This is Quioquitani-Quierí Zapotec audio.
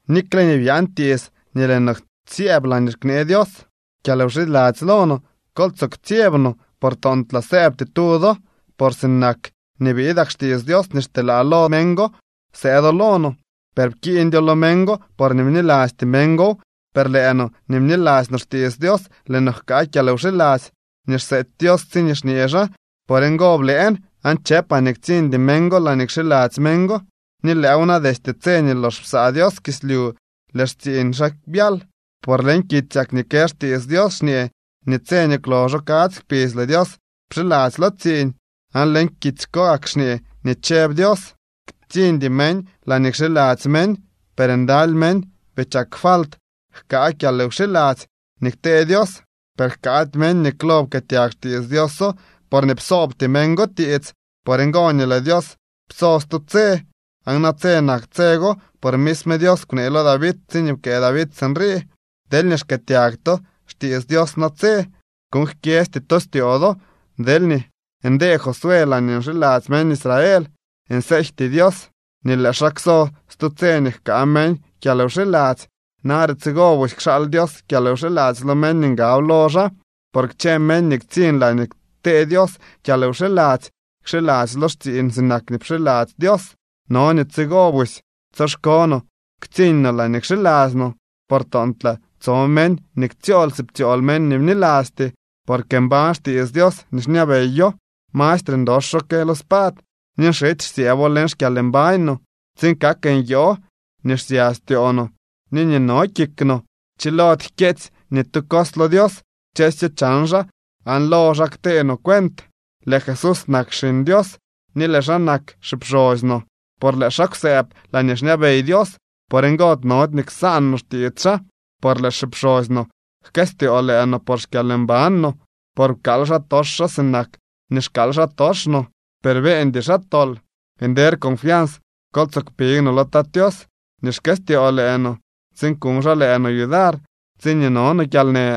Nikxe nii byaan tiits nii lëë no syëëb laañee knee Dios kyalwxiladzy lo no, kol tsoo ktsyeb no, por toontlaa sëëbty tu do. Por sinak nii biidak xtiits Dios nii xteelaa lo meñ go, sëëdo lo no, per pkiiñdyo lo meñ go, porñee bnilasty meñ gow. Per lëë no nii bniladzy no xtiits Dios, lëë no jkaa kyalwxiladzy nii xseety Dios, tsiñee xñee xaa: Por ngo blëën aan chëpaa nii ktsiñdy meñ go laañee kxiladzy meñ go. Ni lëëw na, destye tse nii lox psaa Dios kislyu, lëë xtsiiñ xaa byal. Por leñ kitsyak nii kë xtiits Dios xñee nii tse nii kwloxo kadzy kpidz lëë Dios pxiladzy lo tsiiñ. Aan leñ kitsy ko gak xñee nii chëb Dios: Ktsiñdy meñ laañee kxiladzy meñ. Per ndaly meñ bii chak falt jkaa kyalwxiladzy nii ktee Dios. Per jkaady meñ nii klo pkëëtyag xtiits Dioso, porñee psoobty meñ go tiits. Por ngo nii lëë Dios pso stu tse, aan natse nak tse go. Por misme Dios kwnee lo David tsiñee pkëë David sinrii: Deelñee xkëëtyag to xtiits Dios natse, kuuñ jkyesty to styoo do. Deelñee ndee Josué laañee nxiladzy meñ Israel, nseejty Dios nii lëë xaa kso stu tse nii jkaa meñ kyalwxiladzy. Nare tsigo busy kxaal Dios kyalwxiladzy lo meñ nii ngab lo xaa. Por kchë meñ nii ktsiñ laañee ktee Dios kyalwxiladzy kxiladzy lo xtsiiñ sinak nii pxiladzy Dios. No nii tsigo busy tsyoxko no ktsiiñ no laañee kxiladzy no, por toontlaa tso meñ nii ktsyool si ptsyool meñ nii bnilasty. Porque mbañ xtiits Dios ni xñabeyo. Mastre ndoxo que lo spad, ni nxity xsyëëbo leñ xkyalmbañ no tsiin kak nyoo nii xsya styoo no ni nii no kik no. Chilody jkyeetsy ni tu cos lo Dios. Kchësyo chan xaa aan lo xaa ktee no cuent. Lëë Jesús nak Xiñ Dios ni lëë xaa nak xipxosy no, por lëë xaa kwsëëb laañee xñabey Dios. Por ngo nody nii ksaan no xtiits xaa. Por lëë xipxosy no jkëstyoo lëë no por xkyalmban no, por pkaal xaatox xaa sinak nii xkaal xaatox no, per beeñdy xaa tol. Nder confians kol tsoo kpig no lo Tat Tios nii xkëstyoo lëë no, tsiin kuñ xaa lëë no yudar tsiñee no no kyalnë.